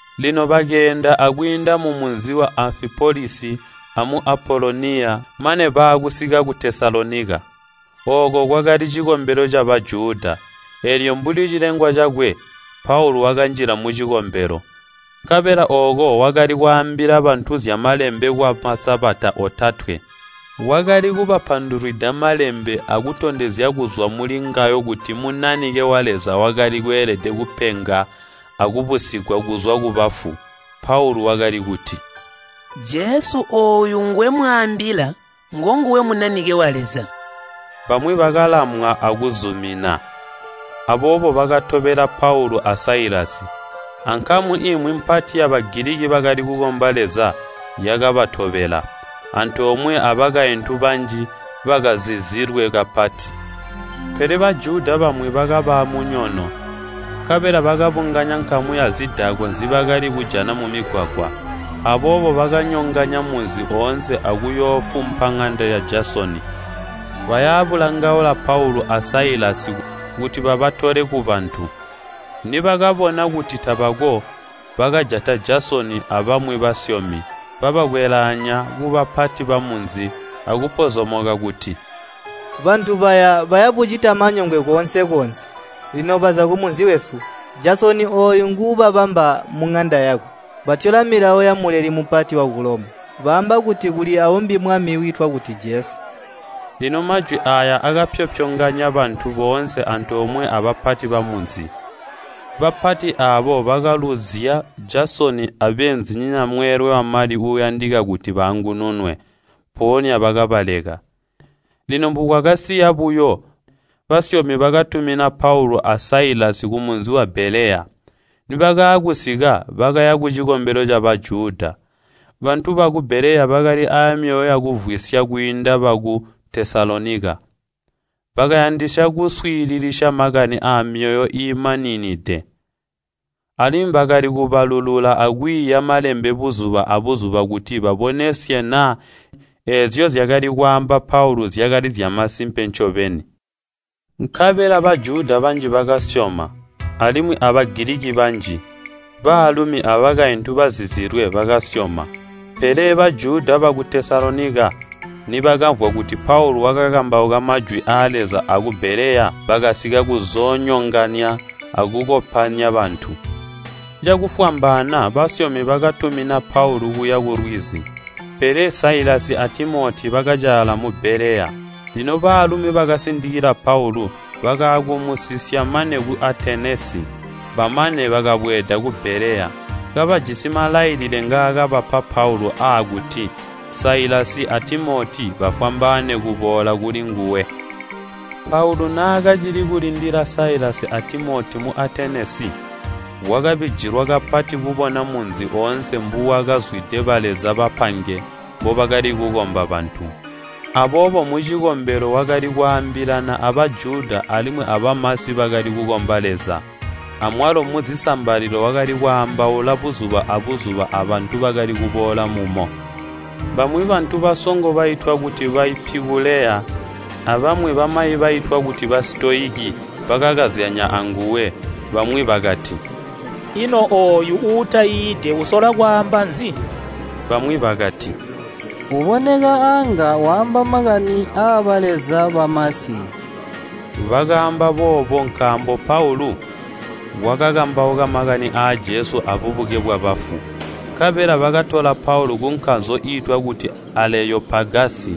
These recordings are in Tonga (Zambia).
Lino bakeenda akwiinda mumunzi wa Amfipolisi amu Apoloniya mane baakusika ku Tesalonika. Ooko kwakali cikombelo ca Bajuda, eelyo mbuli cilengwa cakwe, Paulu wakanjila mucikombelo. Nkabela ooko wakali kwaambila bantu zya Malembe kwa Masabata otatwe. Wakali kubapandulwida Malembe akutondezya kuzwa mulingawo kuti Munanike wa Leza wakali kweelede kupenga akubusigwa kuzwa kubafu. Paulu wakali kuti, “Jesu ooyu ngwemwaambila, ngonguwe Munanike wa Leza.” Bamwi bakalamwa akuzumina, aboobo bakatobela Paulu a Sailasi, ankamu imwi mpati ya Bagiliki bakali kukomba Leza yakabatobela, antoomwe abakaintu banji bakazizilwe kapati. Pele Bajuda bamwi bakaba aamunyono, nkabela bakabunganya nkamu yazidakwa nzibakali kujana mumigwagwa. Aboobo bakanyonganya munzi oonse akuyoofumpa ŋanda ya Jasoni, baya bulangaula Paulu a Sailasi kuti babatole kubantu. Nibakabona kuti tabako, bakajata Jasoni abamwi basyomi, babakwelaanya kubapati bamunzi akupozomoka kuti, “Bantu baya, baya bucita manyongwe koonse-koonse. Lino baza kumunzi wesu! Jasoni ooyu nguubabamba muŋanda yakwe. Batyola milawo ya Muleli Mupati waku Loma. Baamba kuti kuli aumbi mwami, wiitwa kuti Jesu.” Lino majwi aaya akapyopyonganya bantu boonse antoomwe abapati bamunzi. Bapati aabo bakalunzya Jasoni abeenzinyina mweelwe wamali uuyandika kuti baangununwe, mpoonya bakabaleka. Lino mbukwakasiila buyo, basyomi bakatumina Paulu a Sailasi kumunzi wa Beleya. Nibakaakusika, bakaya kucikombelo ca Bajuda. Bantu baku Beleya bakali aamyoyo yakumvwisya kwiinda baku Tesalonika. Bakayandisya kuswiililisya makani amyoyo iimaninide, alimwi bakali kubalulula akwiiya Malembe buzuba abuzuba kuti babonesye naa eezyo nzyaakali kwaamba Paulu zyakali zyakasimpe ncobeni. Nkabela Bajuda banji bakasyoma, alimwi a Bagiliki banji, baalumi abakaintu bazizilwe bakasyoma. Pele Bajuda baku Tesalonika nibakamvwa kuti Paulu wakakambauka majwi aa Leza aku Beleya bakasika kuzoonyonganya akukopanya bantu. Cakufwambaana basyomi bakatumina Paulu kuya kulwizi, pele Sailasi a Timoti bakacaala mu Beleya. Lino baalumi bakasindikila Paulu bakaakumusisya mane ku Atenesi. Bamane bakabweeda ku Beleya, kabajisi malailile ngaakabapa Paulu aakuti Sailasi a Timoti bafwambaane kuboola kulinguwe. Paulu naakacili kulindila Sailasi a Timoti mu Atenesi, wakabijilwa kapati kubona munzi oonse mbuwakazwide baleza bapange mbobakali kukomba bantu. Aboobo mucikombelo wakali kwaambilana a Bajuda alimwi abamasi bakali kukomba Leza, amwalo muzisambalilo wakali kwaambaula buzuba abuzuba abantu bakali kuboola mumo. Bamwi bantu basongo baitwa kuti Baipikuleya abamwi bamayi baitwa kuti Basitoyiki bakakazyanya anguwe. Bamwi bakati, “Ino ooyu uutaiide usola kwaamba nzi?” Bamwi bakati, “Uboneka anga waamba makani aabaleza bamasi.” Bakaamba boobo nkaambo Paulu wakakambauka makani aa Jesu aabubuke bwabafu. Nkabela bakatola Paulu kunkanzo iitwa kuti Aleopagasi,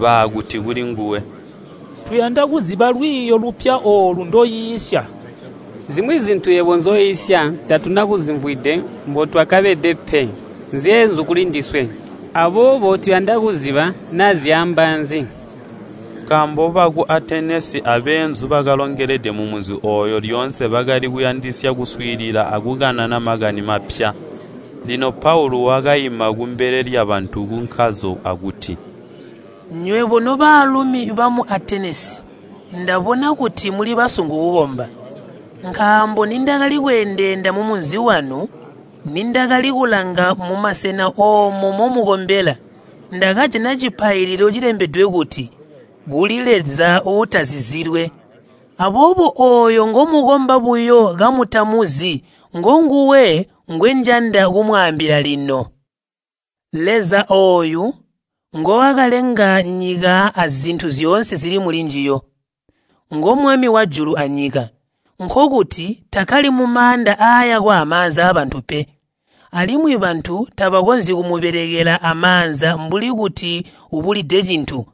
baakuti kulinguwe, “Tuyanda kuziba lwiiyo lupya oolu ndoiisya. Zimwi zintu yebo nzyoiisya tatuna kuzimvwide mbotwakabeda pe, nzyeenzu kulindiswe. Aboobo tuyanda kuziba naa zyaamba nzi.” (Nkaambo baku Atenesi abeenzu bakalongelede mumunzi ooyu lyoonse bakali kuyandisya kuswiilila akukanana makani mapya.) Lino Paulu wakaima kumbele lyabantu kunkanzo akuti, “Nywebo nobaalumi bamu Atenesi ndabona kuti muli basungu kukomba. Nkaambo nindakali kweendeenda mumunzi wanu, nindakali kulanga mumasena oomo momukombela, ndakajana cipaililo cilembedwe kuti, ‘Kuli Leza Uutazizilwe.’ Aboobo ooyo ngomukomba buyo kamutamuzi ngonguwe ngwenjanda kumwaambila lino. Leza ooyu, nguwakalenga nyika azintu zyoonse zili mulinjiyo. Ngo Mwami wajula anyika, nkokuti takkali mumaanda aayakwa amaanza aabantu pe. Alimwi bantu tabakonzyi kumubelekela amaanza mbuli kuti ubulide cintu.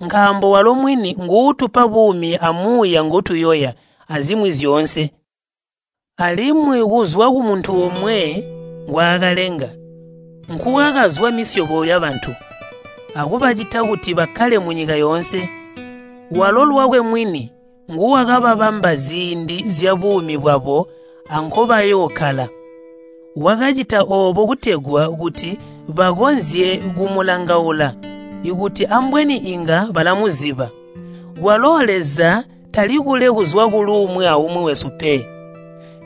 Nkaambo walo mwini nguutupa buumi amuuya ngotuyoya, azimwi zyoonse. Alimwi kuzwa kumuntu omwe ngwaakalenga, nkukwakazwa misyobo yabantu, akubacita kuti bakkale munyika yoonse. Walo lwakwe mwini nguwakabamba ziindi zyabuumi bwabo ankobayookkala. Wakacita oobo kutegwa kuti bakakonzye kumulangaula, kuti ambweni inga balamuziba. Kwalo Leza tali kule kuzwa kuluumwi aumwi wesu pe.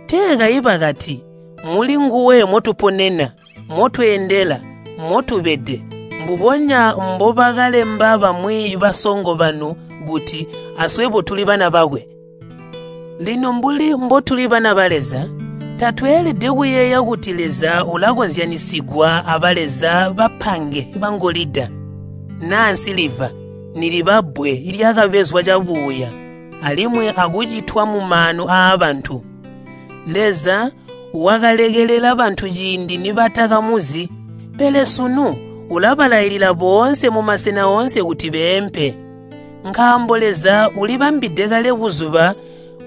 Tee kayi bakati, ‘Mulinguwe motuponena, motweendela, motubede.’ Mbubonya mbobakalemba bamwi basongo banu kuti, ‘Aswebo tuli bana bakwe.’ Lino mbuli mbotuli bana ba Leza, tatweelede kuyeeya kuti Leza ulakozyanyisigwa abaleza bapange bangolida, naa nsiliva, niliba bbwe lyakabezwa cabuuya alimwi akucitwa mumaanu aabantu. Leza wakalekelela bantu ciindi nibatakamuzi, pele sunu ulabalailila boonse mumasena oonse kuti beempe. Nkaambo Leza ulibambide kale buzuba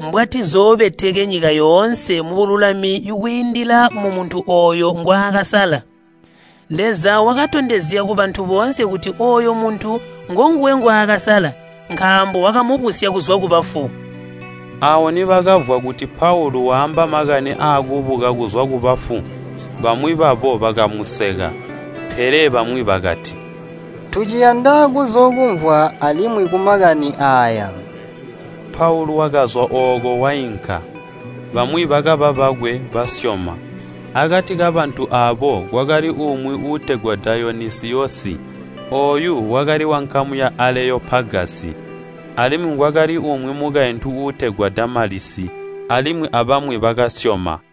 mbwatizoobeteke nyika yoonse mubululami kwiindila mumuntu ooyo ngwaakasala. Leza wakatondezya kubantu boonse kuti ooyo muntu ngonguwe ngwaakasala nkaambo wakamubusya kuzwa kubafu!” Aawo nibakamvwa kuti Paulu waamba makani aakubuka kuzwa kubafu, bamwi babo bakamuseka, pele bamwi bakati, “Tuciyanda kuzookumvwa alimwi kumakani aaya.” Paulu wakazwa ooko wainka. Bamwi bakaba bakwe, basyoma. Akati kabantu aabo kwakali umwi uutegwa Dayonisiyosi. Ooyu wakali wankamu ya Aleyopagasi. Alimwi kwakali umwi mukaintu uutegwa Damalisi, alimwi abamwi bakasyoma.